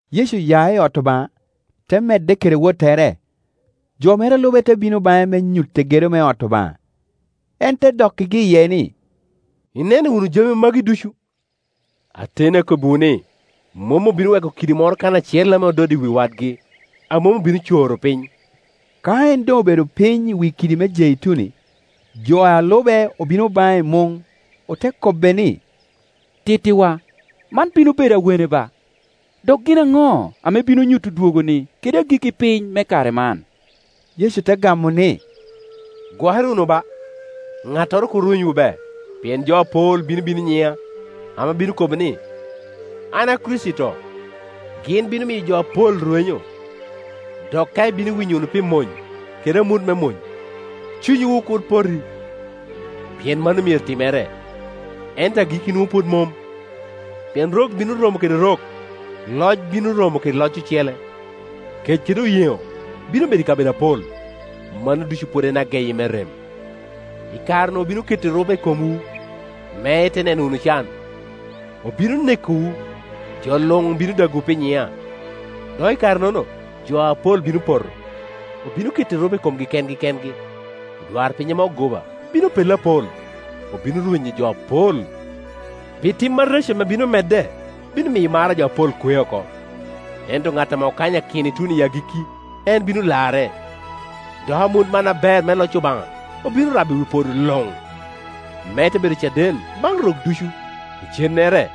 Yecu oya i ot Obaŋa, te medde kede wottere, jo mere a lube te bino baŋe me nyutte gedo me ot Obaŋa. En te dokkigi iye ni, “Ineno wunu jami magi ducu? Ateni akobbiwu ni, mom obino weko kidi moro kan acel ame ododde i wi wadgi, a mom obino coro piny.” Ka en doŋ obedo piny i wi kidi me Jeituni, jo a lube obino baŋe i muŋ, ote kobbe ni, “Tittiwa, man bino bedo awene ba? Dok gin aŋo ame bino nyuto dwogoni kede agikki piny me kare man?” Yecu te gamo ni, “Gwokere wunu ba, ŋattoro kur rwenywu be. Pien jo apol bino bino i nyiŋa, ame obino kobo ni, ‘An a Kricito’, gin bino miyo jo apol rwenyo. Dok ka ibino winyo wunu pi mony kede amut me mony, cunywu kur poti, pien mano myero timere, ento agikki nwoŋo pwod mom. Pien rok bino romo kede rok, loc bino romo kede loc ocele, kec kede oyeŋo bino bedo i kabedo apol; mano ducu pwod en ageyi me rem. “I kare-nu obino keto erupe i komwu me ite neno wunu can, obino nekowu, jo luŋ bino dagowu pi nyiŋa. Dok i kare-nono jo apol bino poto, obino keto erupe i komgi kengi kengi. Odwarpiny ame ogoba bino pello apol, obino rwenyo jo apol. Pi tim areco ame bino medde bino miyo mar a jo apol kwe oko. Ento ŋat ame kanyakino ituno i agikki, en bino larre. Dok amut man aber me loc Obaŋa obino rabo i wi podo luŋ, me te bedo caden baŋ rok ducu; icennere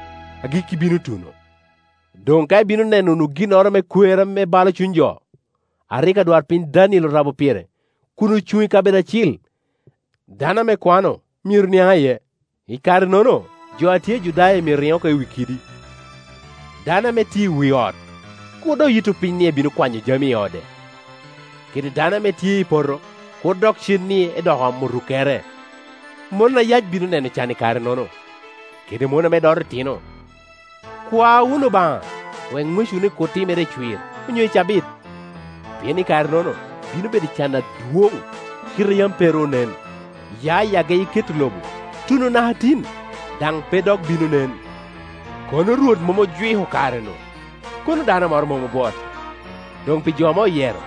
agikki bino tuno. “Doŋ ka ibino neno wunu ginnoro me kwer ame balo cuny jo, a rik adwarpiny Daniel orabo pire, kun ocuŋ i kabedo acil (dano ame kwano myero niaŋ iye), i karenono jo a tye i Judaya myero riŋ oko i wi kiddi. Dano ame tye i wi ot kur dok yitto piny ni ebino kwanyo jami i ode; kede dano ame tye i poto kur dok cen ni edok omo rukkere. Mon ayac bino neno can i kare-nono, kede mon ame doto itino! Kwa wunu Obaŋa wek ŋwecwuni kur timere i cwir, onyo i cabit. Pien i kare-nono bino: bedo can adwoŋ, kite a yam pe ru onen, ya i geyi keto lobo tuno naka tin, daŋ pe dok bino nen. Kono Rwot mom ojwiko kare-nu, kono dano moro mom obwot; doŋ pi jo ame oyero,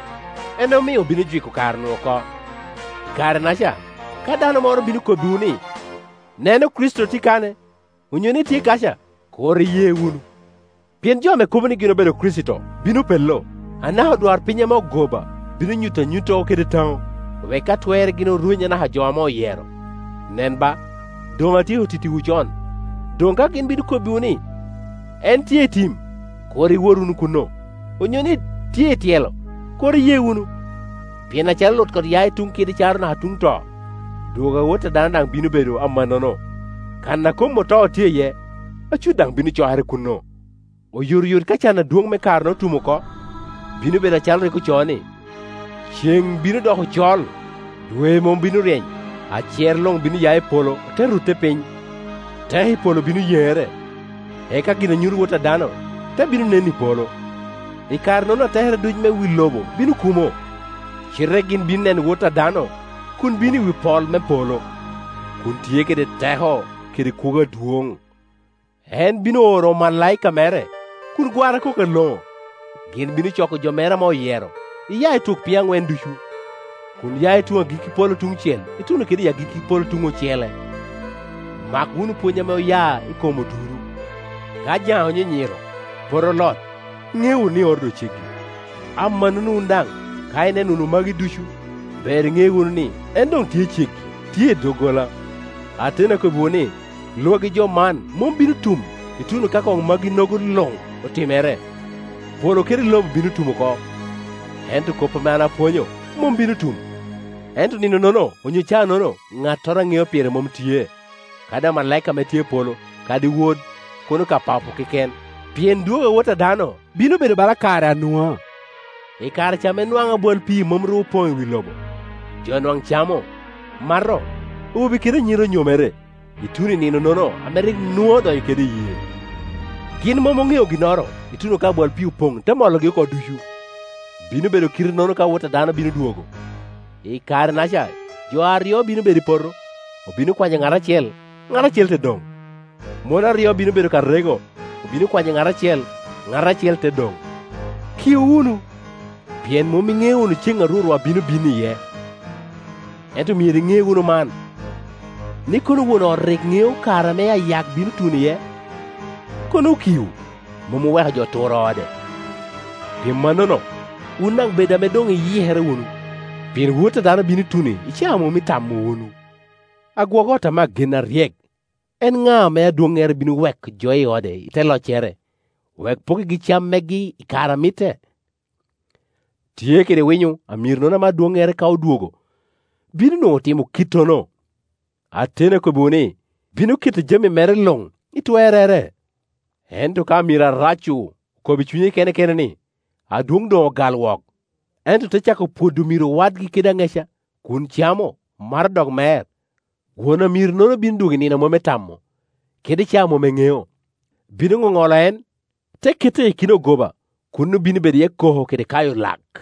en omio obino jwiko kare-nu oko. I kare-naca ka dano moro bino kobbiwu ni, ‘Neno, Kricito tye kane’, onyo ni, ‘Tye kaca’, kur iye wunu, pien jo ame kobo ni gin obedo Kricito bino pello, anaka odwarpiny ame ogoba, bino nyuto anyuttogo kede taŋo, wek ka twerre gin orweny anaka jo ame oyero. Nen ba, doŋ atyeko tittiwu con. Doŋ ka gin bino kobbiwu ni, ‘En tye i tim’, kur iwot wunu kuno, onyo ni, ‘Tye i tyelo’, kur iye wunu. Pien acalo lutkot ya i tuŋ kide caro naka tuŋ to, dwogo a Wot a dano daŋ bino bedo amannono. Kan a kom oto tye iye, acut daŋ bino cokere kuno. “Oyotoyot ka can adwoŋ me karenono otum oko, bino bedo acalo rik ocoo ni, ‘Ceŋ bino doko col, dwe mom bino ryeny, acer luŋ bino ya i polo, ote rutte piny, teko i polo bino yeŋere’; eka gin a nyuto Wot a dano te bino nen i polo, I kare-nono atekere ducu me wi lobo bino kumo, cite gin bino neno Wot a dano kun bino i wi pol me polo, kun tye kede teko kede kwogo adwoŋ. En bino oro omalaika mere kun gwara kok aloŋo, gin bino coko jo mere ame oyero, iya i twok piny aŋwen ducu, kun ya i tuŋ agikki polo tuŋ cel ituno kede i agikki polo tuŋ ocele. “Mak wunu pwony ame oya i kom oduro: ka jaŋe onyinyiro, pote olot, iŋeo wunu ni oro doŋ ceggi. Amannono wun daŋ, ka ineno wunu magi ducu, ber iŋe wunu ni, en doŋ tye ceggi, tye i doggola. Ateni akobbiwu ni, lwagi jo man mom bino tum, ituno ka koŋ magi-nogo luŋ otimere. Polo kede lobo bino tum oko, ento kop ame an apwonyo mom bino tum. “Ento nino-nono, onyo caa-nono, ŋattoro a ŋeo pire mom tye, kadi amalaika ame tye i polo, kadi Wod. Kono ka Papo keken. Pien dwogo a Wot a dano bino bedo bala kare a Nua. I kare ca ame nwaŋ abwal pii mom ru opoŋ i wi lobo, jo nwaŋ camo, mato, awobe kede anyira onyomere, ituno i nino-nono ame rik Nua odonyo kede i yee; gin mom oŋeo ginnoro ituno ka abwal pii opoŋ, te mologi oko ducu. Bino bedo kite-nono ka Wot a dano bino dwogo. I kare-naca jo aryo bino bedo i poto; obino kwanyo ŋat acel, ŋat acel te doŋ. Mon aryo bino bedo ka rego; obino kwanyo ŋat acel, ŋat acel te doŋ. Kiu wunu, pien mom iŋeo wunu ceŋ a Rwotwa bino bino iye. Ento myero iŋe wunu man, ni, kono won ot rik ŋeo kare ame ayak bino tuno iye, kono okio, mom oweko jo oturo ode. Pi mannono, wun daŋ bed ame doŋ iyikere wunu, pien Wot a dano bino tuno i caa a mom itamo wunu. “Agwok ot ame agen, aryek, en ŋa, ame adwoŋŋere bino weko jo i ode i te loccere, wek opokkigi cam megi i kare a mitte? Tye kede winyo amironono ame adwoŋŋere, ka odwogo, bino nwoŋo otimo kite-nono. Ateni akobbiwu ni, bino keto jam i mere luŋ i twerrere. Ento ka amiro arac-cu okobo i cunye kene kene ni, ‘Adwoŋ doŋogal wok’, ento te cako pwodo omiro wadgi kede aŋeca, kun camo, mato, dok mer, won amiro-nono bino dwogo i nino a mom etamo, kede i caa a mom en ŋeo, bino ŋoŋolo en, te kette i akina ogoba; kuno bino bedo iye koko kede kayo lak.